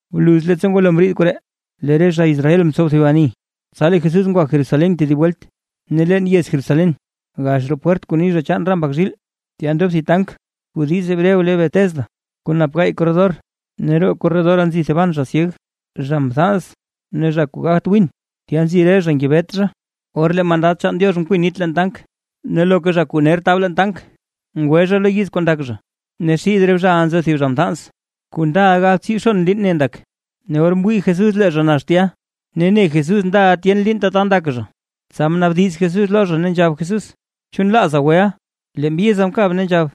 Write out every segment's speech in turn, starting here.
Bluz leettsa ngwalo mriid koree, lee re zha Israel mtsow thib ani, tsa lee Jesús ngwa Jerusalén tedib welt. Ne leen yez Jerusalén, gax roo pwert kuu ni zha chaan re mbak zhiil, tya ndob thib tank kuu diiz hebreo le Betesda, kuu nap gaay korredor, ne roo re korredora nzi thiban zha syeg, zha mthans ne zha kuu gagt gwin. Tya nzi re zha ngebet zha, or lee mandad chaan Diox kwin nit leen tank, ne loka zha kuu ner tab leen tank, ngwe zha lo yiz kuu ndak zha. Ne xid re zhaʼa nzo thib zha mthans kuu ndaʼa galbtsiibxon liin ne ndak. Ne or mwii Jesús lee zha nax tya, ne ne Jesús ndaʼa tyen liin tata ndak zha, tsa mnaabdiz Jesús lo zha, ne nzhab Jesús: ―¿Chu nlaaza weʼa? Lee mbyiza mkab ne nzhab: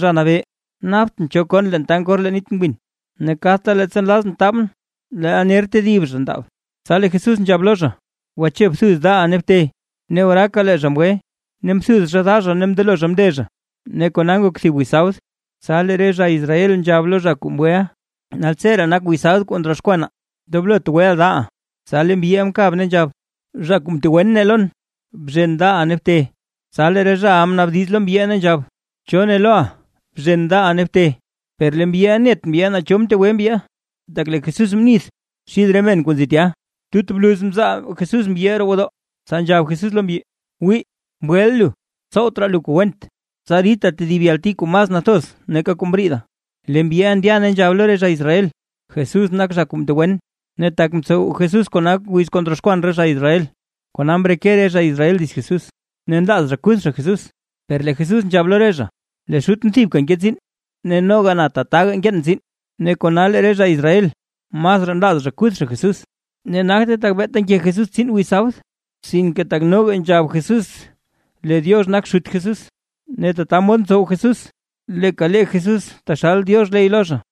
―Zha Nabee, naptʼn cho kon leen tank or lee nit gwin. Ne kadta leettsa nlazʼn taabʼn leel ner tedib zha ndaab. Tsa lee Jesús nzhab lo zha: ―Gwache, bthuz daʼa ne bte. Ne oraaka lee zha mgwe, ne mthuz zha da zha ne mndelo zha mnde zha. Ne kona ngok thib wiz sabd. Tsa lee re zha Israel nzhab lo zha kuu mgweʼa: ―Naltseree nak wiz sabd kuu ndroxkwanaa, ndoblot gweʼa daʼa. Tsa lee mbyiʼa mkab ne nzhab: ―Zha kuu mtegwen ne lon: “Bzhen daʼa ne bte”. Tsa lee re zhaʼa mnaabdiz lo mbyiʼa ne nzhab: ―¿Cho ne loʼa: “Bzhen daʼa ne bte”? Per lee mbyiʼa net mbyi naa cho mtegwe mbyi, tak lee Jesús mnith xid re men kuu nzi tya. Tut bluz mzaal Jesús mbyiʼa roo gwodoo, tsa nzhab Jesús lo mbyi: ―Wii mgweʼa lu, tsowt raa lu kuu went, tsa ridta tedib yalti kuu mas nathoz nake kuu mriida. Lee mbyiʼa ndya ne nzhab lo re zha Israel: “Jesús nak zha kuu mtegwen”. Ne tak mtsow Jesús kona wiz kuu ndroxkwan re zha Israel, kona mreke re zha Israel dits Jesús ne nlaaz zha kuth zha Jesús. Per lee Jesús nzhab lo re zha: ―Lee Xutʼn thibka nke tsiin, ne noga na tataga nkeen tsiin. Ne kona lee re zha Israel masraa nlaaz zha kuth zha Jesús, ne nagte tak beeta nke Jesús tsiin wiz sabd, sinke tak noga nzhab Jesús lee Diox nak Xut Jesús, ne tata mod ntsow Jesús leeka lee Jesús taxal Diox ley lo zha.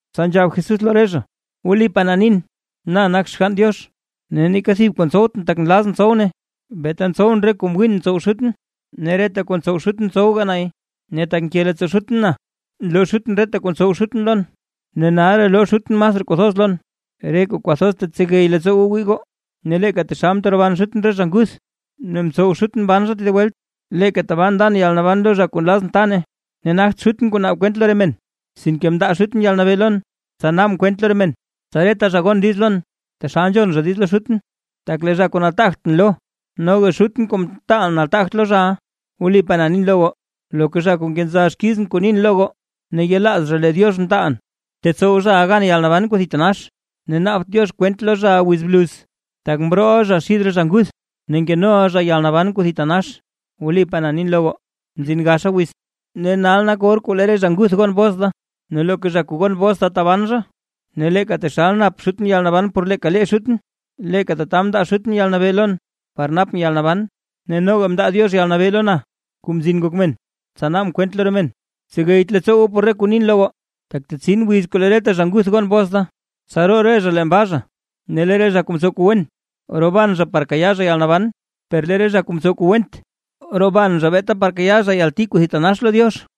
Tsa nzhab Jesús lo re zha: ―Wlipaa na nin, na nak Xgann Diox ne neeka thib kuu ntsowtʼn tak nlazʼn tsow nay, beeta ntsowʼn re kuu ngwiin ntsow Xutʼn. Ne reta kuu ntsow Xutʼn ntsowga nay. Ne tak nke leettsoo Xutʼn na nloo Xutʼn reta kuu ntsow Xutʼn lon, ne nalraa loo Xutʼn masraa kuu thoz lon, re kuu kwathoz tsegey leettsoo goo wii goo. Ne leeka taxal nteroban Xutʼn re zha nguth, ne ntsow Xutʼn mban zha tedib welt, leeka tabaa ndan yalnaban lo zha kuu nlazʼn ta nay. Ne nagt Xutʼn kuu naab kwent lo re men, sinke mndaa Xutʼn yalnabee lon tsa naabʼn kwent lo re men, tsa reta zha gon diiz lon taxal nzhon zha diiz lo Xutʼn; tak lee zha kuu nataagtʼn lo, noga Xutʼn kuu mtaalʼn nataagt lo zhaʼa. ’Wlipaa na nin lo goo, loka zha kuu nkenza xkizʼn kuu nin lo goo, ne yelaaz zha lee Diox mtaalʼn, tetsow zhaʼa gan yalnaban kuu thitanax, ne naabt Diox kwent lo zhaʼa wiz bluz, tak mrooʼa zhaʼa xid re zha nguth ne nkenoʼa zha yalnaban kuu thitanax. Wlipaa na nin lo goo, mzin gaxa wiz, ne nal nak or kuu lee re zha nguth gon bos da, ne loka zha kuu gon bos da taban zha. Ne leeka taxal nap Xutʼn yalnaban por leeka lee Xutʼn, leeka tata mndaa Xutʼn yalnabee lon par napʼn yalnaban, ne noga mndaa Diox yalnabee lo na, Kuu Mzin Ngok Men, tsa naabʼn kwent lo re men. Tsegeyt leettsoo goo por ree kuu nin lo goo, tak tetsin wiz kuu lee reta zha nguth gon bos da, tsa roo re zha leen baa. Ne lee re zha kuu mtsow kuu wen, roban zha par kayaa zha yalnaban, per lee re zha kuu mtsow kuu went, roban zha beeta par kayaa zha yalti kuu thitanax lo Diox.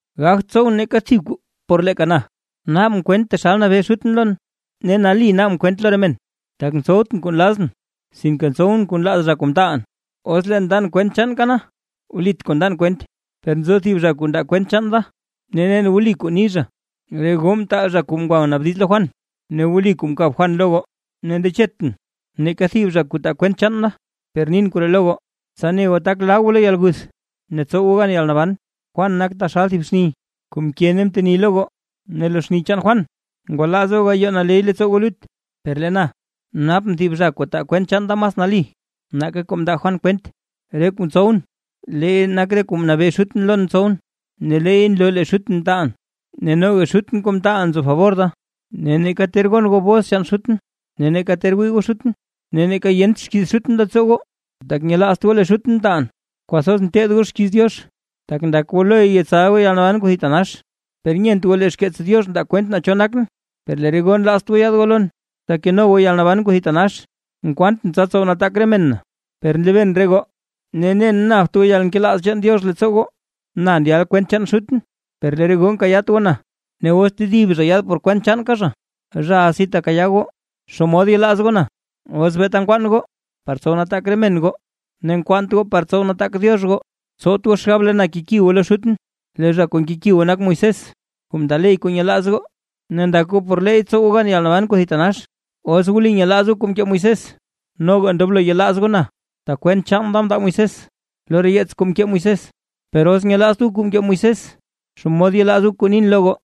’Gagt tsowʼn neeka thib kuu por leeka na. Naabʼn kwent taxal nabee Xutʼn lon, ne nali naabʼn kwent lo re men, tak ntsowtʼn kuu nlazʼn, sinke ntsowʼn kuu nlaaz zha kuu mtaalʼn. Os leen ndan kwent chaanka na, wlit kuu ndan kwent. Per nzo thib zha kuu ndaa kwent chaan da, ne nen wli kuu ni zha. Re goo mtaal zha kuu ngwa mnaabdiz lo Juan, ne wli kuu mkab Juan lo goo. Ne ndechetʼn neeka thib zha kuu taa kwent chaan da, per nin koree lo goo, tsa ne goo tak laa goo lo yalguth ne tsow goo gan yalnaban. Juan nak taxal thib xni kuu mke ne mteni lo goo, ne lo xni chaan Juan ngwalaaz goo gayoo naley leettsoo goo lut. Per lee na, napʼn thib zha kuu taa kwent chaan da mas nali, nake kuu mndaa Juan kwent. Re kuu ntsowʼn leey nak re kuu mnabee Xutʼn lon tsowʼn, ne leey nloo lee Xutʼn mtaalʼn. Ne noga Xutʼn kuu mtaalʼn nzo fabor da, ne neeka ter gon goo bos chaan Xutʼn, ne neeka ter wii goo Xutʼn, ne neeka yent xkiiz Xutʼn leettsoo goo, tak nyelaazt goo lee Xutʼn mtaalʼn. Kwathoz nteed goo xkiiz Diox, tak ndak goo loy yetsal goo yalnaban kuu thitanax, per nyent goo lee xkeets Diox ndaa kwent naa cho nakʼn. Per lee re goo nlaazt goo yaad goo lon, tsa keno goo yalnaban kuu thitanax. ’Nkwaantʼn tsa tsow nataak re men na. Per nlebeen re goo, ne nen napt goo yalnkelaaz chaan Diox leettsoo goo. Na ndyalʼn kwent chaan Xutʼn, per lee re goo nkayaat goo na, ne os tedib zha yaad por kwent chaanka zha, zhaʼa si tekayaa goo. ¿Xomod yelaaz goo na, os beeta nkwaan goo par tsow nataak re men goo, ne nkwaant goo par tsow nataak Diox goo? Tsowt goo xgab lee na keki goo lo Xutʼn, lee zha kuu nkeki goo nak Moisés kuu mndaa ley kuu nyelaaz goo, ne ndak goo por leey tsow goo gan yalnaban. Os wli nyelaaz goo kuu mkee Moisés, noga ndoblo yelaaz goo na, tak kwent chaan da mndaa Moisés lo re yeets kuu mkee Moisés. Per os nyelaazt goo kuu mkee Moisés, ¿xomod yelaaz goo kuu nin lo goo?